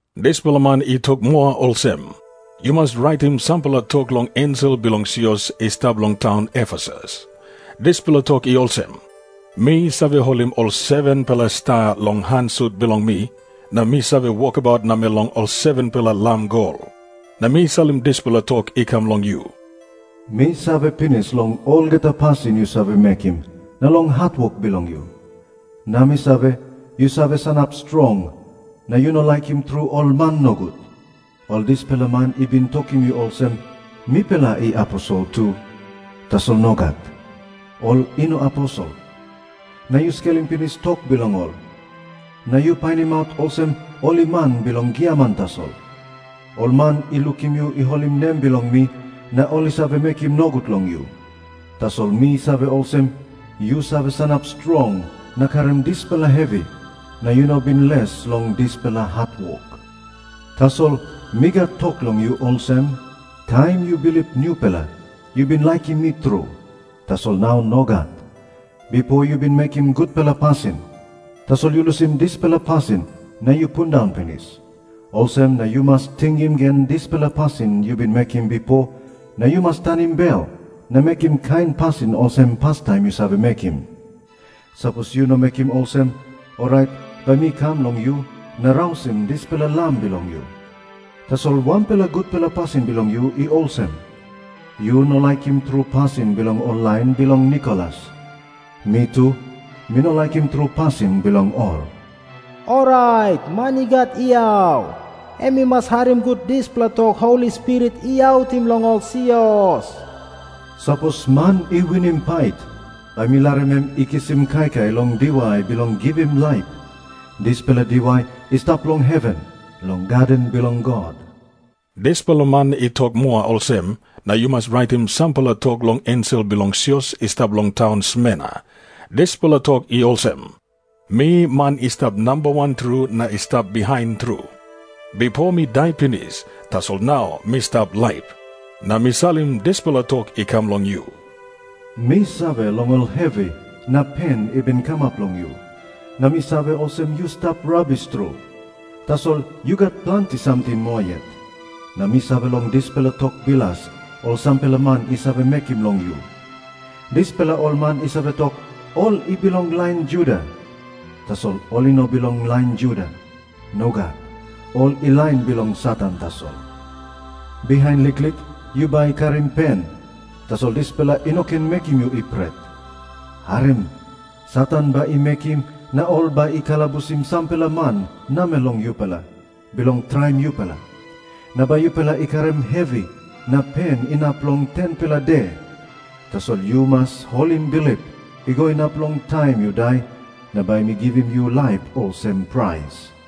Dispela man i tok moa olsem, “Yu mas raitim sampela tok long ensel bilong sios i stap long taun Efesus. Dispela tok i olsem, ‘Mi save holim ol 7-pela sta long han sut bilong mi, na mi save wokabaut namel long ol 7-pela lam gol. Na mi salim dispela tok i kam long yu. Mi save pinis long olgeta pasin yu save mekim, na long hatwok bilong yu. Na mi save, yu save sanap strong, na yu no laikim tru ol man nogut. Ol dispela man i bin tokim yu olsem, “Mipela i aposel tu.” Tasol nogat, ol i no aposel. Na yu skelim pinis tok bilong ol, na yu painimaut olsem ol i man bilong giaman tasol. Ol man i lukim yu i holim nem bilong mi, na ol i save mekim nogut long yu. Tasol mi save olsem, yu save sanap strong na karim dispela hevi, na yu no bin les long dispela hatwok. “ ‘Tasol mi gat tok long yu olsem, taim yu bilip nupela, yu bin laikim mi tru, tasol nau nogat. Bipo yu bin mekim gutpela pasin, tasol yu lusim dispela pasin na yu pundaun pinis. Olsem na yu mas tingim gen dispela pasin yu bin mekim bipo, na yu mas tanim bel na mekim kain pasin olsem pastaim yu save mekim. Sapos yu no mekim olsem, orait bai mi kam long yu na rausim dispela lam bilong yu. Tasol wanpela gutpela pasin bilong yu i olsem. Yu no laikim tru pasin bilong ol lain bilong Nikolas. Mi tu, mi no laikim tru pasin bilong ol. “ ‘Orait man i gat yau, em i mas harim gut dispela tok Holi Spirit i autim long ol sios. Sapos man i winim pait, bai mi larim em i kisim kaikai long diwai bilong givim laip. Dispela diwai i stap long heven, long gaden bilong God.’” Dispela man i tok moa olsem, “Na yu mas raitim sampela tok long ensel bilong sios i stap long taun Smerna. Dispela tok i olsem, ‘Mi man i stap namba wan tru na i stap bihain tru. Bipo mi dai pinis, tasol nau mi stap laip. Na mi salim dispela tok i kam long yu. Mi save long ol hevi na pen i bin kamap long yu, na mi save olsem yu stap rabis tru. Tasol yu gat planti samting moa yet. Na mi save long dispela tok bilas ol sampela man i save mekim long yu. Dispela ol man i save tok, ol i bilong lain Juda. Tasol ol i no bilong lain Juda. Nogat. Ol i lain bilong Satan tasol. Bihain liklik yu bai karim pen, tasol dispela i no ken mekim yu i pret. Harim. Satan bai i mekim, na ol bai i kalabusim sampela man namel long yupela, bilong traim yupela. Na bai yupela i karim hevi na pen inap long 10-pela de. Tasol yu mas holim bilip, i go inap long taim yu dai, na bai mi givim yu laip olsem prais.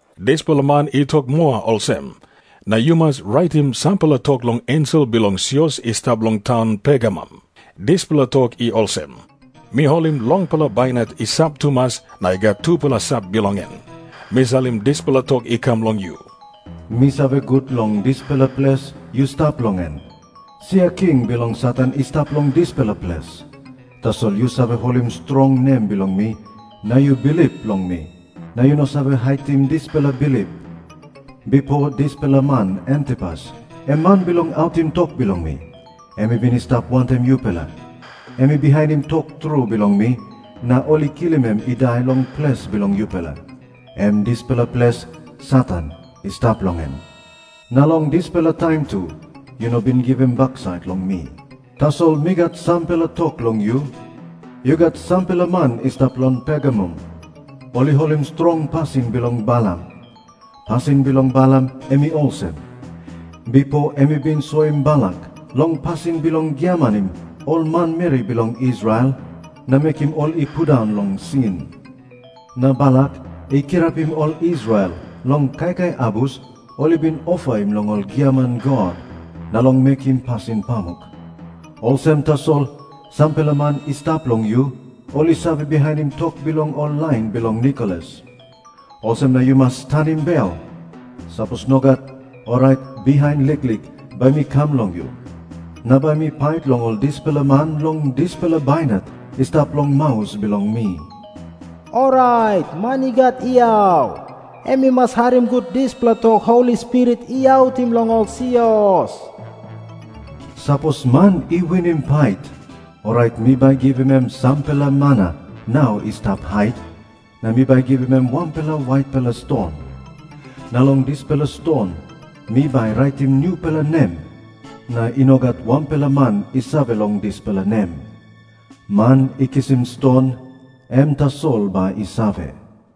Dispela man i tok moa olsem, “Na yu mas raitim sampela tok long ensel bilong sios i stap long taun Pergamum. Dispela tok i olsem, ‘Mi holim longpela bainat i sap tumas na i gat tupela sap bilong en. Mi salim dispela tok i kam long yu. Mi save gut long dispela ples yu stap long en. Sia king bilong Satan i stap long dispela ples. Tasol yu save holim strong nem bilong mi, na yu bilip long mi, na yu no save haitim dispela bilip. Bipo dispela man Antipas, em man bilong autim tok bilong mi, em i bin i stap wantaim yupela. Em i bihainim tru tok bilong mi, na ol i kilim em i dai long ples bilong yupela, em dispela ples Satan i stap long en. Na long dispela taim tu yu no bin givim baksait long mi. “ ‘Tasol mi gat sampela tok long yu. Yu gat sampela man i stap long Pergamum, ol i holim strong pasin bilong Balam. Pasin bilong Balam em i olsem. Bipo em i bin soim Balak long pasin bilong giamanim ol manmeri bilong Israel na mekim ol i pundaun long sin. Na Balak i kirapim ol Israel long kaikai abus ol i bin ofaim long ol giaman god, na long mekim pasin pamuk. Olsem tasol, sampela man i stap long yu, ol i save bihainim tok bilong ol lain bilong Nikolas. Olsem na yu mas tanim bel. Sapos nogat, orait bihain liklik bai mi kam long yu, na bai mi pait long ol dispela man long dispela bainat i stap long maus bilong mi. “ ‘Orait man i gat yau, em i mas harim gut dispela tok Holi Spirit i autim long ol sios. Sapos man i winim pait, orait mi bai givim em sampela mana nau i stap hait, na mi bai givim em wanpela waitpela ston. Na long dispela ston mi bai raitim nupela nem, na i no gat wanpela man i save long dispela nem. Man i kisim ston, em tasol bai i save.’”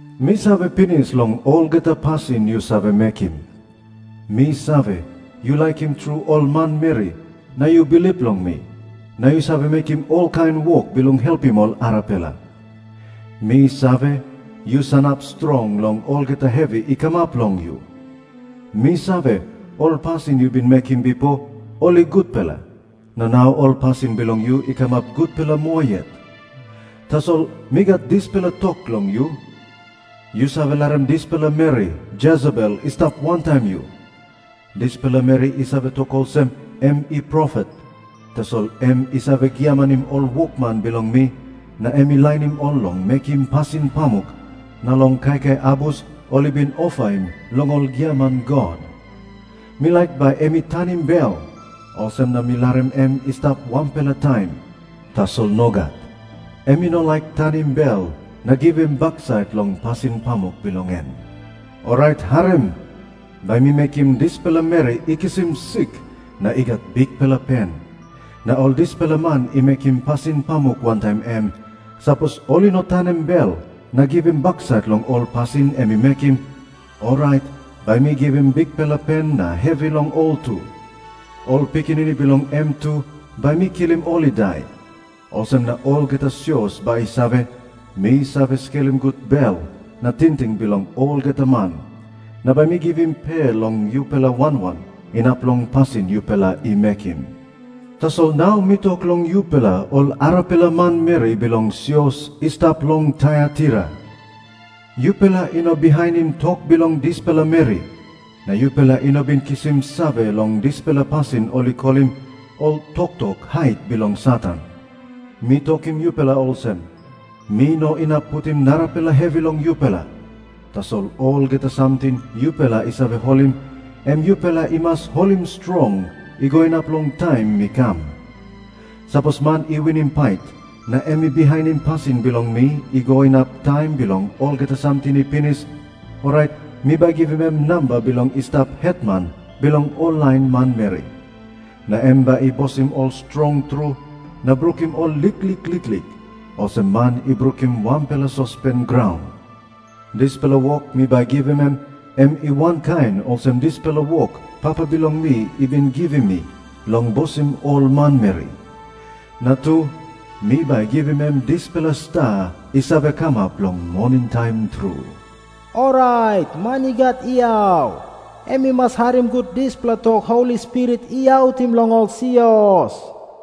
Mi save pinis long olgeta pasin yu save mekim. Mi save, yu laikim tru ol manmeri, na yu bilip long mi, na yu save mekim olkain wok bilong helpim ol arapela. Mi save, yu sanap strong long olgeta hevi i kamap long yu. Mi save, ol pasin yu bin mekim bipo, ol i gutpela, na nau ol pasin bilong yu i kamap gutpela moa yet. “ ‘Tasol mi gat dispela tok long yu. Yu save larim dispela meri Jesebel i stap wantaim yu. Dispela meri i save tok olsem em i profet, tasol em i save giamanim ol wokman bilong mi na em i lainim ol long mekim pasin pamuk na long kaikai abus ol i bin ofaim long ol giaman god. Mi laik bai em i tanim bel, olsem na mi larim em i stap sampela taim. Tasol nogat. Em i no laik tanim bel na givim baksait long pasin pamuk bilong en. Orait harim. Bai mi mekim dispela meri i kisim sik na i gat bikpela pen. Na ol dispela man i mekim pasin pamuk wantaim em, sapos ol i no tanim bel na givim baksait long ol pasin em i mekim, orait bai mi givim bikpela pen na hevi long ol tu. Ol pikinini bilong em tu, bai mi kilim ol i dai. Olsem na olgeta sios bai i save, mi save skelim gut bel na tingting bilong olgeta man. Na bai mi givim pe long yupela wan wan, inap long pasin yupela i mekim. “ ‘Tasol nau mi tok long yupela ol arapela manmeri bilong sios i stap long Taiataira. Yupela i no bihainim tok bilong dispela meri, na yupela i no bin kisim save long dispela pasin ol i kolim “Ol toktok hait bilong Satan.” Mi tokim yupela olsem, mi no inap putim narapela hevi long yupela. Tasol olgeta samting yupela i save holim, em yupela i mas holim strong, i go inap long taim mi kam. “ ‘Sapos man i winim pait, na em i bihainim pasin bilong mi i go inap taim bilong olgeta samting i pinis, orait mi bai givim em namba bilong i stap hetman bilong ol lain manmeri. Na em bai i bosim ol strong tru na brukim ol liklik liklik, olsem man i brukim wanpela sospen graun. Dispela wok mi bai givim em, em i wankain olsem dispela wok Papa bilong mi i bin givim mi bilong bosim ol manmeri. Na tu, mi bai givim em dispela sta i save kamap long moningtaim tru. Orait man i gat yau, em i mas harim gut dispela tok Holi Spirit i autim long ol sios.’”